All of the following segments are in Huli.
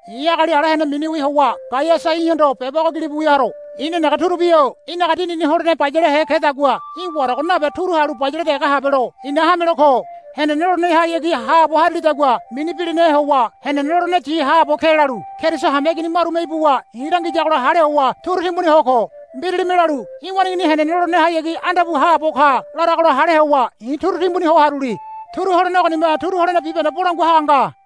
I̱ agali ala hene miniwi howa Gaiasa í̠hondo beba ogo gilibu wia haro. I̱ nenege turubi-o í̠naga dinini holene bayalehe kedagua í̠ warago nabe turu halu bayale dege habelo i̱na hamelo ko. Henene lolenehayagi haabo harilidagua mini bilinahe howa henene loleneyi haabo ke lalu Keriso hameigini marume ibuwa i̱ langiyagola hale howa turu timbuni ho ko. Mbiralime lalu, Í̠ waneigini henene lolenehayagi anda pu haabo ka, laragola hale howa i̱ turu timbuni ho haruli. Turu holene ogonime turu holene bibahende bolangua haga nga.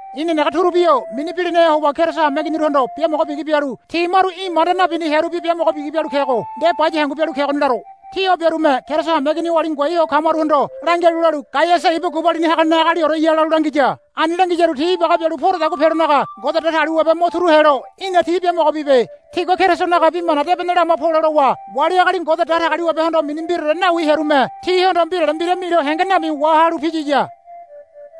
I̱ nenege turubi-o mini bilinahe howa Keriso hameiginiruhondo biamogo bigi bialu ti maru í̠ manda nabini hearubi biamogo bigi bialu kego nde baya hangu bialu kegoni laro. Ti o biarume Keriso hameigini oali ngoai ho kamaruhondo langialu lalu, Gaiasa ibu gubalini hagane agalioreya, lalu langiya. Ani langiyaru ti ibaga bialu poradagua pelonaga Ngode Datagaliwabe mo turu helo í̠na ti biamogo bibe. Tigua Kerisonaga Bi Mana Debene lama pole lowa wali agali Ngode Datagaliwabehondo mini mbiraore nawi hearume tihondo mbirale mbira milo henge nami wahalu piyiya.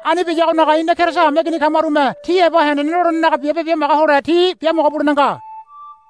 Ani biyagonaga ina Keriso hameigini kamarume ti heba henene lolenenaga biabe bimaga hole ti biamogo bulene nga.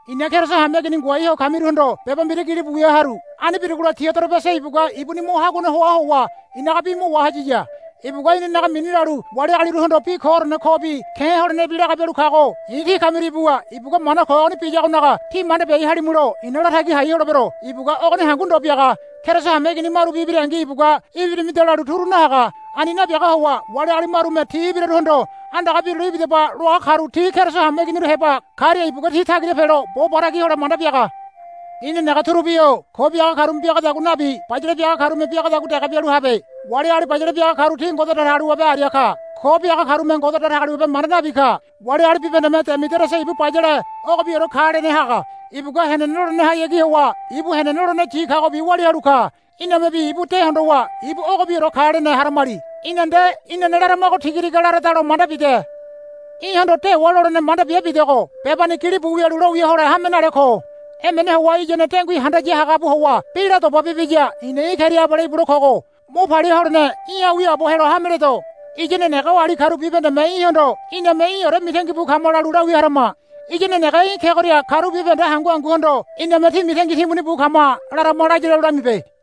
I̱na Keriso hameigini ngoai ho kamiruhondo beba mbira gilibu wia haru. Ani birugola Diodorebese ibugua ibuni mo haguane hoa howa i̱naga bi mo wahayiya. Ibugua inanaga mini lalu wali agaliruhondo bi koorene kobi ke̱ holenebi laga bialu kago i̱ tí kamiria ibuwa ibugua mana ko ogoni biyagonaga tí manda biai halimulo i̱na latagi hai holebero. Ibugua ogoni hangu ndo biaga. Keriso hameigini marubi ibirangi ibugua, Ibirimida, lalu turu nahaga. Ani nabiaga howa wali agali marume ti ibiraruhondo, Andaga birule ibidaba, loa karu ti Keriso hameiginiru heba karia ibugua ti tagira pelo bo batagi hole manda biaga. I̱ nenege turubi-o ko biaga karume biagadagua nabi bayale biaga karume biagadagua dege bialu habe. Wali agali bayale biaga karu ti Ngode Datagaliwabe aria ka. Ko biaga karume Ngode Datagaliwabe manda nabi ka. Wali agali bibahendeme Demidiriasa ibu bayale ogobiore ka lene haga. Ibugua henene lolenehayagi howa ibu henene loleneyi kagobi walia halu ka. Inamebi ibu de hondowa ibu ogobiore ka lene haramali. Í̠na nde inane laramago tigatiga laradalo manda bide. Í̠hondo dewa lolene manda bia bidogo bebani gilibu wialu lowia hole hame nale ko. Emene howa iyane dengui handaya hagabu howa bi la doba bibiya i̱na í̠ keria abale ibule kogo. Mo palia holene í̠ha wiaabo helo hameledo. Iya nenege oali karu bibahendeme í̠hondo, Iname í̠ore mitangi bu kama, lalu lawia harama. Iya nenege í̠ kegoria karu bibahende hangu hanguhondo iname, Tí mitangi timbuni bu kama, larama laya lalu lamibe.